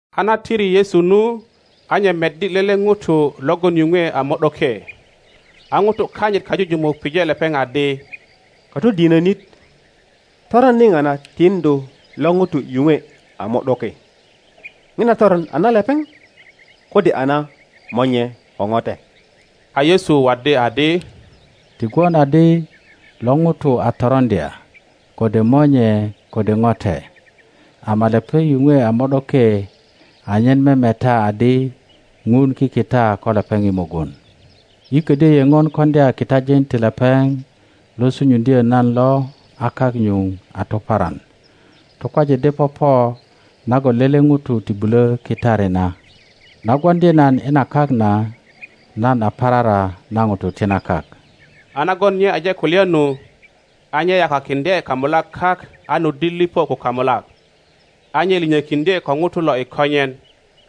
A na tiri Yesu nu, a nye meddilele ŋuto logon yuŋwe a mo ’doke. A ŋutu kanyit kajujumuk pije lepeŋ adi, Katodinönit, toron niŋa na tiŋdu lo ŋuto yuŋwe a mo ’doke? Ŋina toron a na lepeŋ, kode a na monye ko ŋote? A Yesu waddi adi, Ti gwon adi lo ŋuto a toroŋdya, kode monye ko ŋote, ama lepeŋ yuŋwe a mo ’doke anyen memeta adi Ŋun kikita ko lepeŋ i mugun. Yi ködyö yeŋon koŋdya kitajin ti lepeŋ lo sunyuŋdyö nan lo a kak nyuŋ a tuparan. Tukwaje de popo nagon lele ŋuto ti bulö kitari na. Na gwoŋdi nan i na kak na, nan a parara na ŋutu ti na kak. A nagon nye aje kulya nu, a nye yakakiŋdye kamulak kak a nuddi lipo ko kamulak, a nye linyokiŋdye ko ŋuto lo i konyen,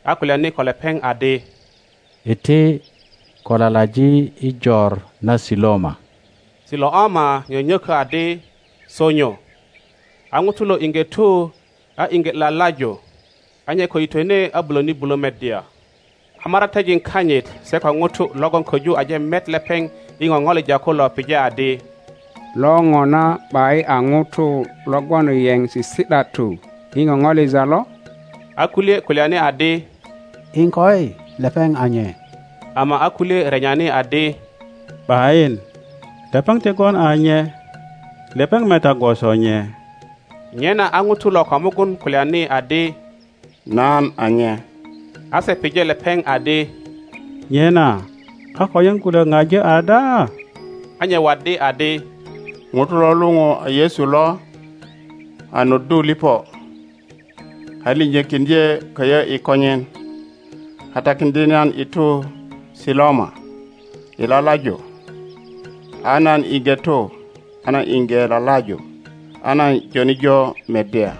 a kulyani ko lepeŋ adi, Iti, ko lalaji i jor na Siloama. (Siloama nyönyökö adi, Sonyo.) A ŋuto lo iŋge tu, a iŋge lalaju, a nye ko yitwene a bulöni bulö meddya. A maratejin kanyit se ko ŋutu logon köju aje met lepeŋ i ŋoŋolija kulo pije adi, Lo ŋona ’bayin a ŋuto logon yeŋ sisi ’datu i ŋoŋolija lo? A kulye kulyani adi, Iŋkoi, lepeŋ a nye; ama a kulye renyani adi, ’Bayin, lepeŋ ti gwon a nye. Lepeŋ meta gwoso nye. Nyena a ŋuto lo ko mugun kulyani adi, Nan a nye. A se pije lepeŋ adi, Nyena a konyen kulök ŋaji ada? A nye waddi adi, Ŋuto lo luŋu a Yesu lo a nuddu lipo, a liŋyökiŋdye köyö i konyen, a takiŋdye nan i tu Siloama i lalaju. A nan iŋge tu a nan iŋge lalaju, a nan joni jo meddya.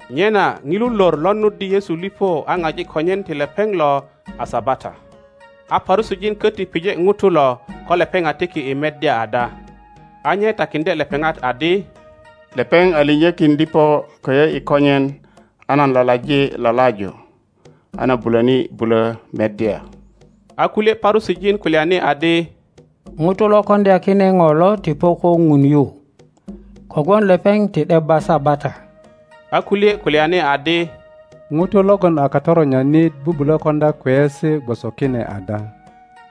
Nyena ŋilu lor lo nuddi Yesu lipo a ŋaji konyen ti lepeŋ lo a Sabata. A Parusijin köti pije ŋuto lo ko lepeŋ a tiki i meddya ada. A nye takiŋdye lepeŋat adi, Lepeŋ a liŋyökin lipo köyö i konyen a nan lalaji lalaju, a nan bulöni bulo meddya. A kulye Parusijin kulyani adi, Ŋuto lo koŋdya kine ŋo lo ti po ko Ŋun yu, kogwon lepeŋ ti ’debba Sabata. A kulye kulyani adi, Ŋuto logon a katoronyanit bubulö koŋdya kweyesi gwoso kine ada?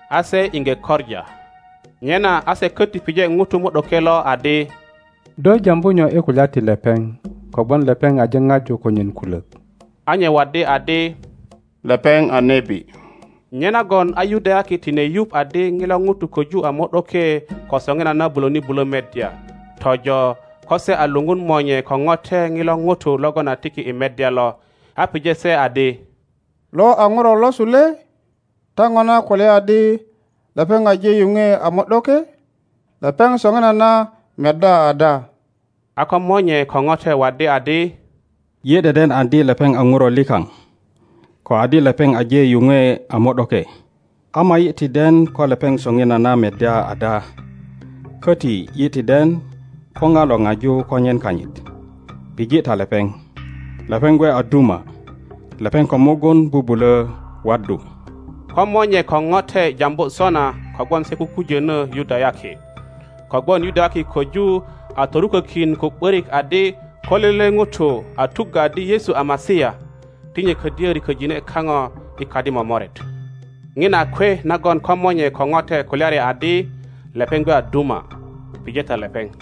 A se iŋge koŋa. Nyena a se köti pije ŋuto mo ’doke lo adi, Do jambu nyo i kulya ti lepeŋ kogwon lepeŋ aje ŋaju konyen kulök? A nye waddi adi, Lepeŋ a nebi. Nyenagon a Yudayaki tine yuŋ adi ŋilo ŋuto köju a mo ’doke ko soŋinana bulöni bulö meddya, tojo ko se a luŋun monye ko ŋote ŋilo ŋuto logon a tiki i meddya lo, a pije se adi, Lo a ŋuro losu le? Ta ŋona kulya adi lepeŋ aje yuŋwe a mo ’doke? Lepeŋ soŋinana meddya ada? a ko monye ko ŋote waddi adi, Yi deden adi lepeŋ a ŋuro likaŋ, ko adi lepeŋ aje yuŋwe a mo ’doke. Ama yi ti den ko lepeŋ soŋinana meddya ada, köti yi ti den ko ŋa lo ŋaju konyen kanyit. Pije ta lepeŋ, lepeŋ gwe a duma; lepeŋ ko mugun bubulö waddu. Ko monye ko ŋote jambu sona kogwon se kujönö Yudayaki. Kogwon Yudayaki köju a torukökin ko ’börik adi ko lele ŋuto a tuggö adi Yesu a Masia, ti nye ködyö riköjine kaŋo i kadi momoret. ŋina a kwe nagon ko monye ko ŋote kulyari adi, Lepeŋ gwe a duma, pije ta lepeŋ.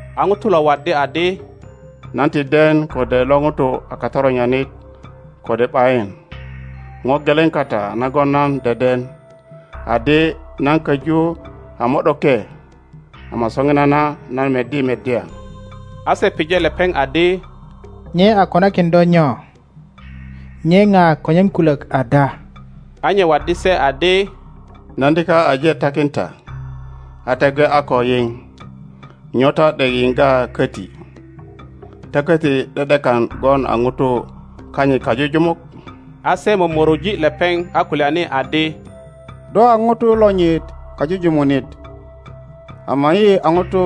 A ŋuto lo waddi adi, Nan ti den kode lo ŋuto a katoronyanit kode ’bayin; lo geleŋ kata nagon nan deden, adi nan köju a mo ’doke, ama soŋinana nan meddi meddya. a se pije lepeŋ adi, Nye a konakin do nyo? Nye ŋa konyen kulök ada? A nye waddi se adi, Nan dika aje takin ta, a ta gwe a ko yiŋ. Nyo ta ’dek yiŋga köti? Ta köti ’de ’dekan gwon a ŋutu kanyit kajujumuk? A se momoroji lepeŋ a kulyani adi, Do a ŋuto lonyit kajujumunit, ama yi a ŋutu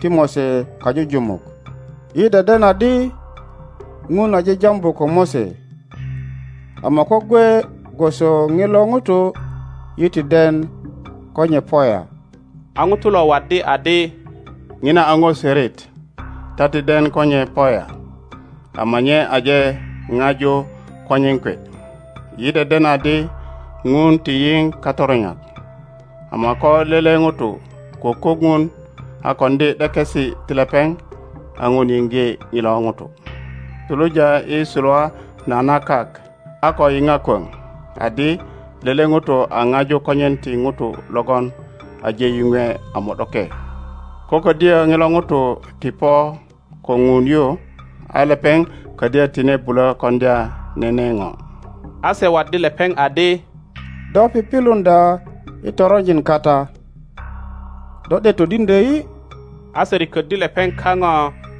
ti Mose kajujumuk. yi deden adi Ŋun aje jambu ko Mose; ama ko gwe gwoso ŋilo ŋuto yi ti den ko nye po ya. A ŋuto lo waddi adi, Ŋina a ŋo sörit! Ta ti den ko nye po ya, ama nye aje ŋaju konyen kwe! Yi deden adi Ŋun ti yiŋ katoronyak, ama ko lele ŋuto kukuk Ŋun a koŋdi ’dekesi ti lepeŋ, a Ŋun yiŋge ŋilo ŋuto. Suluja i suluwa na na kak a ko yiŋa kwöŋ adi lele ŋuto a ŋaju konyen ti ŋuto logon aje yuŋwe a mo ’doke. Ko ködyö ŋilo ŋuto ti po ko Ŋun yu, a lepeŋ ködyö tine bulö koŋdya nene ŋo. A se waddi lepeŋ adi, Do pipiluŋdya i toronjin kata. Do ’dek todiŋdyö yi? A se riköddi lepeŋ kaŋo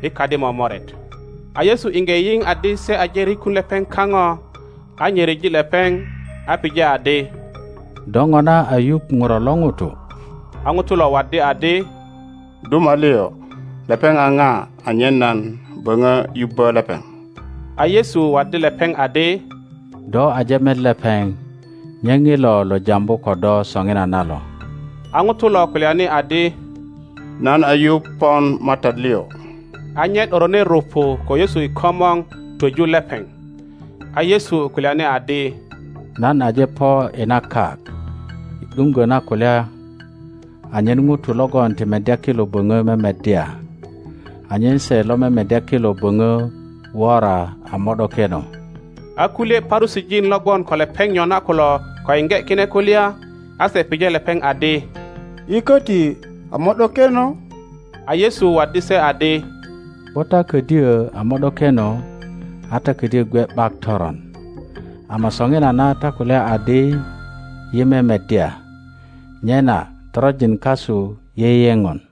i kadi momoret. A Yesu iŋge yiŋ adi se aje rikun lepeŋ kaŋo, a nye ryeji lepeŋ, a pije adi, Do ŋona a yuŋ Ŋuro lo ŋuto? A ŋuto lo waddi adi, Duma liŋ, lepeŋ a ŋa anyen nan böŋö yubbö lepeŋ? a Yesu waddi lepeŋ adi, Do aje met lepeŋ; nye ŋilo lo jambu ko do soŋinana lo. A ŋuto lo kulyani adi, Nan a yuŋ pon MATAT liŋ; a nye ’dorone rupu ko Yesu i komor twöju lepeŋ. a Yesu kulyani adi, Nan aje po i na kak i ’duŋgö na kulya, anyen ŋutu logon ti meddya kilo boŋö memeddya, anyen se lo memeddya kilo böŋö wora a mo ’dokeno. A kulye Parusijin lo gwon ko lepeŋ nyona kulo ko yiŋge kine kulya, a se pije lepeŋ adi, Yi köti a mo ’dokeno? A Yesu waddi se adi, Ko ta ködyö a mo ’dokeno a ta ködyö gwe ’bak toron. Ama soŋinana ta kulya adi, Yi memeddya; nyena toronjin kasu yeyeŋon.